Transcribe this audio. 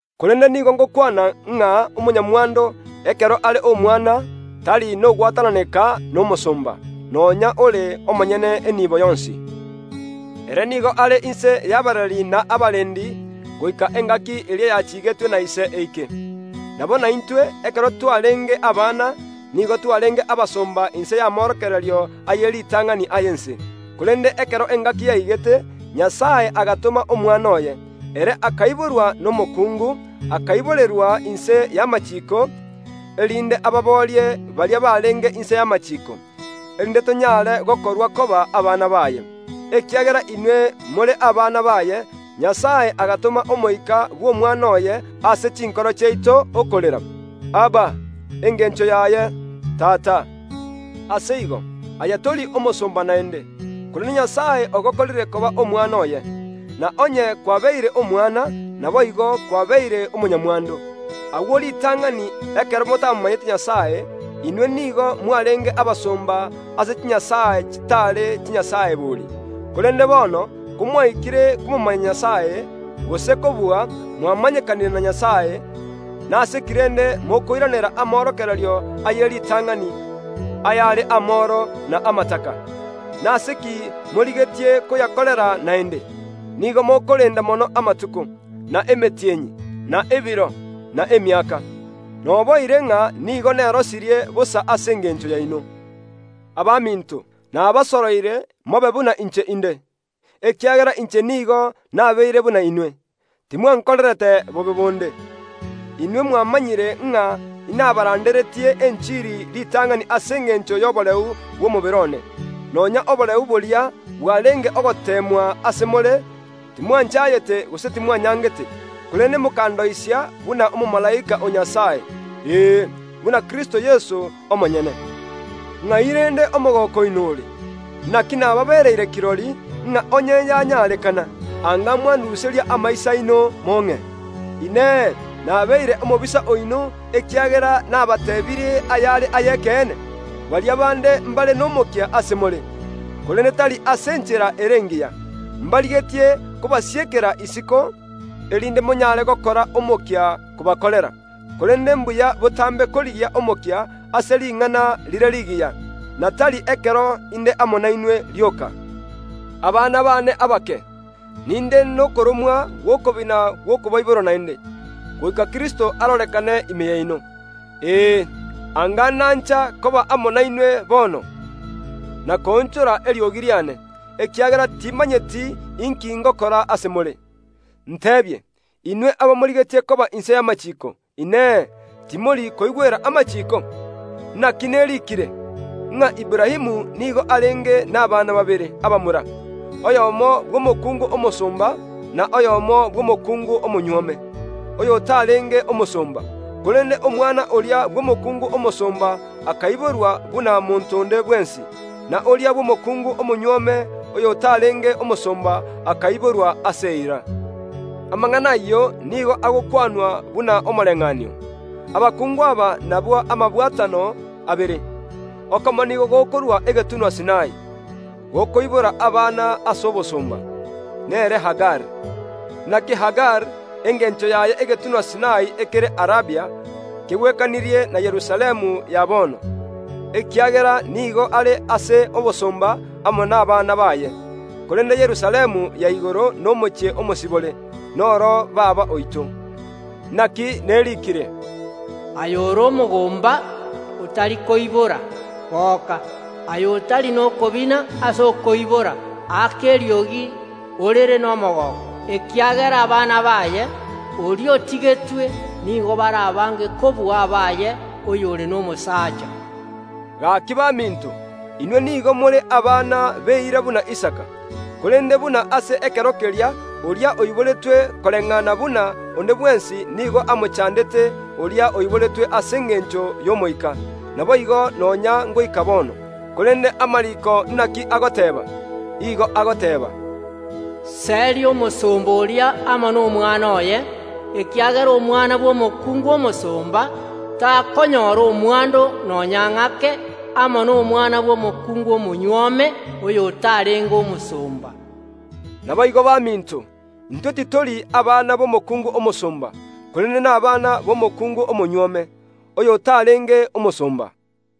Korende nigo ngokwana ng’a omonyamwando, ekero are omwana, tari nogwatananeka nomosomba, nonya ore omonyene enibo yonsi. Ere nigo are inse y’abareri na abarendi goika engaki eria yachigetwe na ise eike. Nabo naintwe, ekero twarenge abana, nigo twarenge abasomba inse y’amorokererio aye ritang’ani y’ense. Korende ekero engaki yaigete, Nyasae agatoma Omwana oye; ere akaiborwa nomokuungu, akaiborerwa inse y’amachiiko, erinde ababoorie baria barenge inse y’amachiiko, erinde tonyare gokorwa koba abana baye. Ekiagera inwe more abana baye, Nyasae agatoma Omoika bw’Omwana oye ase chinkoro chiaito, okorera, “Abba!” Engencho yaye “Tata!” Ase igo, aye tori omosomba naende, korende Nyasae ogokorire koba omwana oye; na onye kwabeire omwana, naboigo kwabeire omonyamwando. Agwo ritang’ani, ekero motamomanyete Nyasae, inwe nigo mwarenge abasomba ase chinyasae chitare chinyasae bori. Korende bono, komwaikire komomanya Nyasae, gose kobua, mwamanyekanire na Nyasae, nase ki rende mokoiranera amorokererio aye ritang’ani, ayare amoro na amataka? Nase ki morigetie koyakorera naende? Nigo mokorenda mono amatuko, na emetienyi, na ebiro, na emiaka. Noboire ng’a nigo nerosirie bosa ase engencho yaino. Abaminto, nabasoroire, mobe buna inche inde, ekiagera inche nigo nabeire buna inwe. Timwankorerete bobe bonde. Inwe mwamanyire ng’a inabaranderetie enchiri ritang’ani ase engencho y’oboreu bw’omobere one. Nonya oboreu boria bwarenge ogoteemwa ase more timwanchayete gose timwanyangete, korende mokandoisia buna omomalaika o Nyasae ee, buna Kristo Yeso omonyene. Ng’ai rende omogooko oino ore? Naki nababereire kirori, ng’a onye yanyarekana, anga mwanduseria amaiso aino mong’e. Inee! Nabeire omobisa oino, ekiagera nabateebirie ayare ay’ekeene? Baria bande mbare nomokia ase more, korende tari ase enchera ere engiya; mbarigetie kobasiekera isiko, erinde monyare gokora omokia kobakorera. Korende mbuya botambe korigia omokia ase ring’ana rire rigiya, na tari ekero inde amo nainwe rioka. Abana baane abake, ninde nokoromwa gw’okobina gw’okobaibora naende, goika Kristo arorekane ime yaino. Ee, anga nancha koba amo nainwe bono, na koonchora eriogi riane, ekiagera timanyeti inki ngokora ase more. Nteebie, inwe abamorigetie koba inse y’amachiiko, Inee, timori koigwera amachiiko? Naki neriikire, ng’a Aburaamu nigo arenge nabana babere abamura, oyomo bw’omokuungu omosomba, na oyomo bw’omokuungu omonyuome, oyotarenge omosomba. Korende omwana oria bw’omokuungu omosomba akaiborwa buna monto onde bwensi; na oria bw’omokuungu omonyuome, oyotarenge omosomba, akaiborwa ase eira. Amang’ana ayio nigo agokwanwa buna omoreng’anio. Abakungu aba nabwo amabwatano abere. Okomo nigo gokorwa egetunwa Sinai, gokoibora abana ase obosomba; nere Hagari. Naki Hagari, engencho yaye egetunwa Sinai ekere Arabia, kegwekanirie na Yerusalemu ya bono, ekiagera nigo are ase obosomba amo nabana baye. Korende Yerusalemu ya igoro nomochie omosibore, noro baba oito. Naki neriikire, “Aye ore omogomba, otari koibora, goka! Aye otari nokobina ase okoibora, aka eriogi, orere nomogooko, ekiagera abana baye oria otigetwe nigo bare abange kobua abaye oyore nomosaacha.” Gaki baminto, inwe nigo more abana b’eira buna Isaka. Korende buna ase ekero keria oria oiboretwe koreng’ana buna onde bwensi nigo amochandete oria oiboretwe ase engencho y’Omoika, naboigo nonya ngoika bono. Korende amariiko naki agoteeba? Igo agoteeba, “Seria omosomba oria amo nomwana oye, ekiagera omwana bw’omokuungu omosomba takonyora omwando nonya ng’ake amo nomwana bw’omokuungu omonyuome, oyotarenge omosomba.” Naboigo baminto, intwe titori abana b’omokuungu omosomba, korende nabana b’omokuungu omonyuome, oyotarenge omosomba.